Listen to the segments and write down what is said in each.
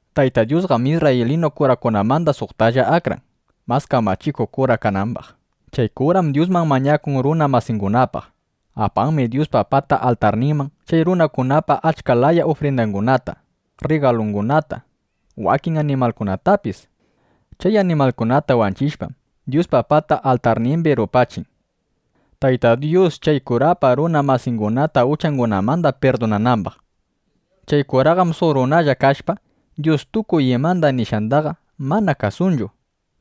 Tayta Dyusqam isrraylinu kurakunamanda suqtalla akran, mas kamachikuq kura kanambaq. Chay kuram Dyusman mañakun runa masingunapaq. Apanmi Dyuspa pata altarninman chay runakunapa achka laya ufrindangunata, rrigalungunata wakin animalningunatapis. Chay animalkunata wanchishpam, Dyuspa pata altarnimbi rupachin, Tayta Dyus chay kurapa runa masingunata uchangunamanda pirdunanambaq. Chay kuraqam suq runalla kashpa, Dyus tukuy ima nishqandaqa mana kasunchu.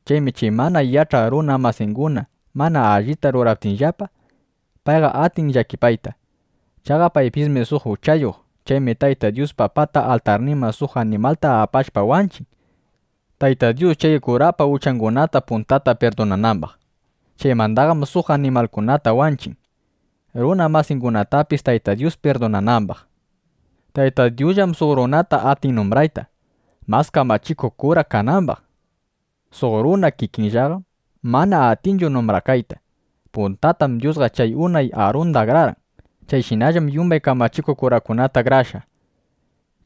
Chaymi chay mana yach'aq runa masinguna mana allita ruraptinllapa, payqa atin llakipayta. Chaqa paypismi suq uchayuq. Chaymi Tayta Dyuspa pata altarninman suq animalta apashpa wanchin, Tayta Dyus chay kurapa uchangunata puntata pirdunanambaq. Chaymandaqam suq animalkunata wanchin, runa masingunatapis Tayta Dyus pirdunanambaq. Tayta Dyusllam suq runata atin numbrayta, mas kamachikuq kura kanambaq. Suq runa kikinllaqam mana atinchu numbrakayta. Puntatam Dyusqa chay unay Arunda akrarqan. Chayshinallam yumbay kamachikuq kurakunata akrashqa.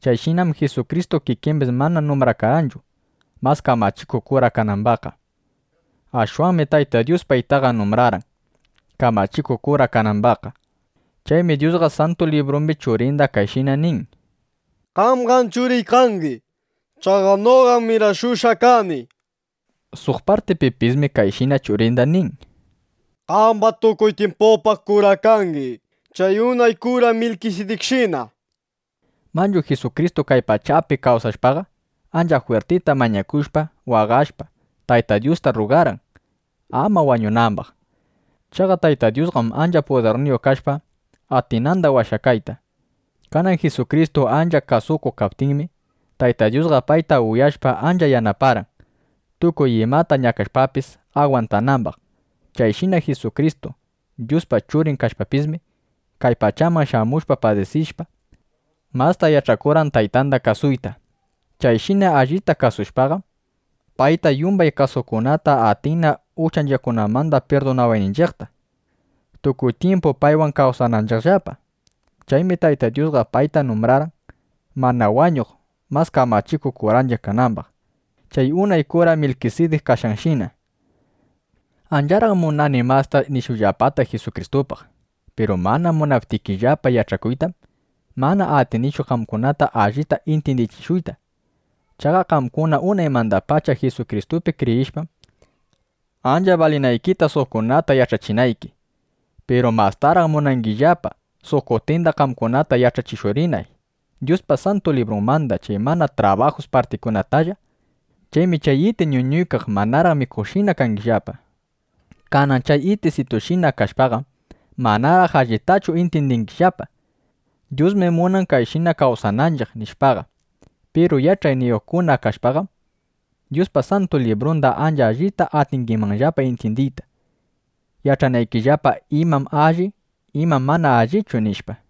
Chayshinam Jisukristu kikimbis mana numbrakarqanchu, mas kamachikuq kura kanambaqqa. Ashwanmi Tayta Dyus paytaqa numbrarqan, kamachikuq kura kanambaqqa. Chaymi Dyusqa Santu Librumbi Churinda kayshina nin: Qamqam Churiy kangi. Chaqa noqam mirashushqa kani, nishpa. Suq partipipismi kayshina Churinda nin: Qamqam tukuy tyimpupaq kura kangi, chay unay kura Milkisidikshina, nishpa. Manchu Jisukristu kay pachapi kawsashpaqa, ancha jwirtita mañakushpa, waqashpa, Tayta Dyusta rrugarqan, ama wañunambaq. Chaqa Tayta Dyusqam ancha pudirniyuq kashpa, atinanda washayta. Kanan Jisukristu ancha kasukuq kaptinmi, Tayta Dyusqa payta uyashpa, ancha yanaparqan, tukuy imata ñakashpapis, agwantanambaq. Chayshina Jisukristu, Dyuspa Churin kashpapismi, kay pachaman shamushpa padisishpa, masta yach'akurqan Taytanda kasuyta. Chayshina allita kasushpaqam, payta yumbay kasuqkunata atinna uchanchiqkunamanda pirdunawayninchiqta, tukuy tyimpu paywan kawsananchiqllapa. Chaymi Tayta Dyusqa payta numbrarqan, mana wañuq mas kamachikuq kuranchiq kanambaq, chay unay kura Milkisidik kashqanshina. Ancharaq munani masta nishuyllapata Jisukristupaq. Piru mana munaptikillapa yach'akuytam, mana atinichu qamkunata allita intyindichishuyta. Chaqa qamkuna unaymandapacha Jisukristupi kriyishpam, ancha balinaykita, suqkunatana yach'achinayki. Piru mastaraq munangillapa, suq kutinda qamkunata yach'achishurinay Dyuspa Santu Librunmanda chay mana trabajus partikunatalla. Chaymi chay iti ñuñuykaq manaraq mikuqshina kangillapa. Kanan chay itisitushina kashpaqam, manaraq allitachu intyindingillapa: Dyusmi munan kayshina kawsananchiq, nishpaqa. Piru yach'ayniyuqkuna kashpaqam, Dyuspa Santu Librunda ancha allita atingimanllapa intyindiyta, yach'anaykillapa: Imam alli, imam mana allichu, nishpa.